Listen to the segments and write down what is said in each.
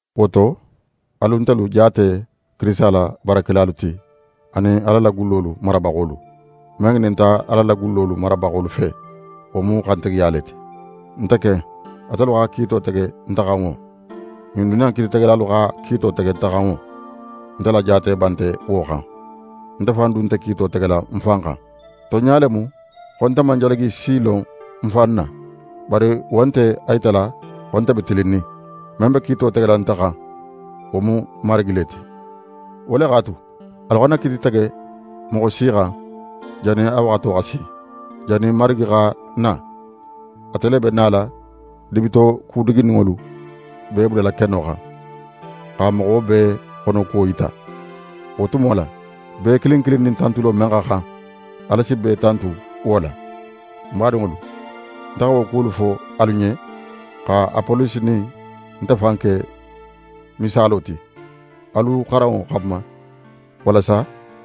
Wo to, alu ntelu jaate Kirisita la baarakelalu ti anin Ala la gullolu marabaxolu. Men ŋininta Ala la gullolu marabaxolu fe, wo mu xantigiya le ti. Nte ken, atelu xa kiito tege nte xan wo, ɲin duniya in kiititegelalu xa kiito tege nte xan wo, nte la jaateba nte wo xan. Nte fan du nte kiito tegela ń fan xan. Tonɲa le mu xo nte man jalagi si lon ń fan na. Bari wo nte a yitala xo nte be tilinnin. Men be kiito tegela nte xan, wo mu Marigi le ti. Wo le x'a tu, alu xana kiiti tege moxo si xan jannin a waxato xa si, jannin Marigi xa na. Ate le be nala dibitoku duguninŋolu bee bulala keno xan, xa moxo bee xonokuwo yita. Wo tumo la, bee kilin kilin nin tantulo men xa xan, Ala si bee tantu wo la. Ń badinŋolu, nte xa wo kuwolu fo alu ɲen, xa Apolosi nin nte fan ke misaalo ti, alu xaranŋo xanma, walasa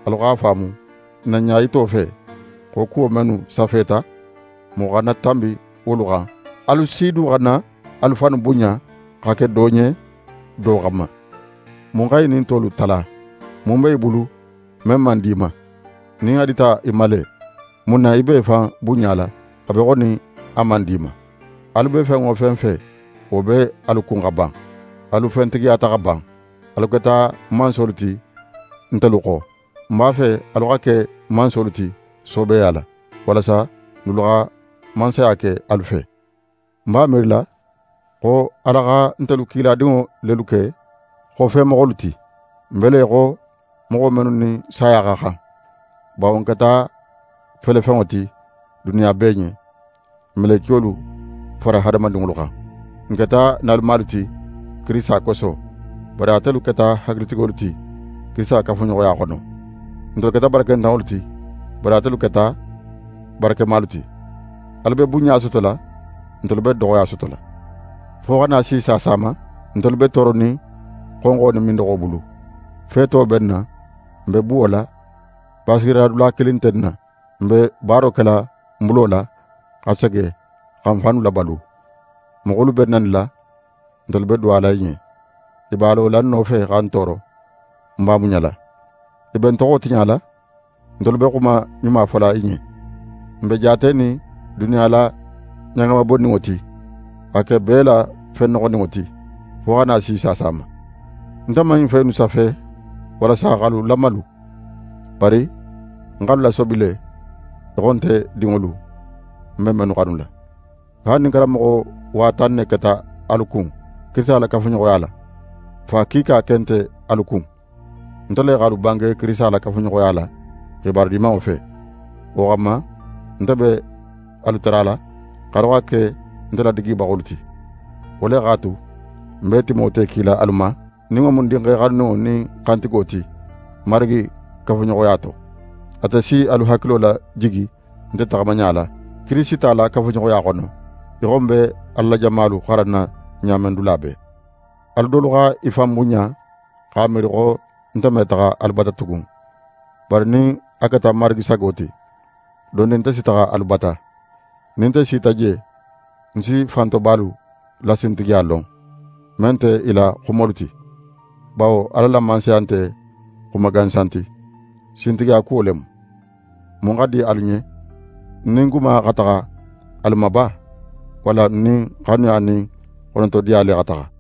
alu x'a faamu n na ɲayito fe, xo kuwo mennu safeta, moxo xana tanbi wolu xan. Alu si du xana alu fannu bunɲa xa ke do ɲen do xanma. Mun xa í nin tolu tala? Mun be í bulu men man di í ma? Nin a dita í ma le, mun na í be í fan bunɲala, a be í xo nin a man di í ma? Alu be fen wo fen fe, wo be alu kun xa ban. Alu fentigiyata xa ban. Alu keta mansolu ti ntelu xo. Ń b'a fe alu xa ke mansolu ti soobeya la, walasa n dulu xa mansaya ke alu fe. Ń b'a miirila xo Ala xa ntelu kiladinŋo lelu ke xofemoxolu ti. N be le í xo moxo mennu nin saya xa xan. Bawo n keta felefenŋo ti duniya bee ɲen, melekiyolu fara hadamadinŋolu xan. N keta nalumalu ti Kirisita koso; bari atelu keta hakilitigolu ti Kirisita kafuɲoxoya xono. Ntelu keta barakentanŋolu ti; bari atelu keta barakemalu ti. Alu be bunɲa sotola; ntelu be doxoya sotola. Fo xa na si saasa ma, ntelu be tooronin xonxo nin mindoxo bulu. Feeto be n na, n be buwola. Basigiradula kilin nte n na. N be baaro kela n bulo la, xa sege xa n fannu labalu. Moxolu be n nanila, ntelu be duwala i ɲen. I b'a lola n nofe xa n tooro, n b'a muɲala. I be n toxo tiɲala, ntelu be xuma ɲuma fola i ɲen. N be jaatenin duniya la ɲagama bonninŋo ti, xa ke bee la fen noxoninŋo ti, fo xa na si saasa ma. Nte man ɲin fen innu safe walasa x'alu lamalu, bari nte x'alu lasobi le í xo nte dinŋolu, ń be mennu xanula. Haali nin karanmoxo wa tan ne keta alu kun Kirisita la kafuɲoxoya la, fa kiika ken nte alu kun. Nte le x'alu bange Kirisita la kafuɲoxoya la, xibaru Dimanŋo fe. Wo xanma, nte be alu tarala x'alu xa ke nte ladigibaxolu ti. Wo le x'a tu, ń be Timote kila alu ma, nin wo mu ń dinxe xanuninŋo nin xantigo ti Marigi kafuɲoxoya to. Ate si alu hakilo lajigi nte taxamaɲa la, Kirisita la kafuɲoxoya xono, í xo ń be Ala la jamalu xaranna ɲa men dula bee. Alu dolu xa i fan bunɲa, x'a miiri xo nte me taxa alu bata tugun. Bari nin a keta Marigi sago ti, dondin nte si taxa alu bata. Nin nte sita je, ń si fantobalu la sintigiya lon, men nte i la xumolu ti. Bawo Ala la Mansaya nte xuma gansan ti; sintigiya kuwo le mu. Mun xa di alu ɲen? Ń nin guma xa taxa alu ma ba, walla ń nin xanuya nin xonotodiya le xa taxa?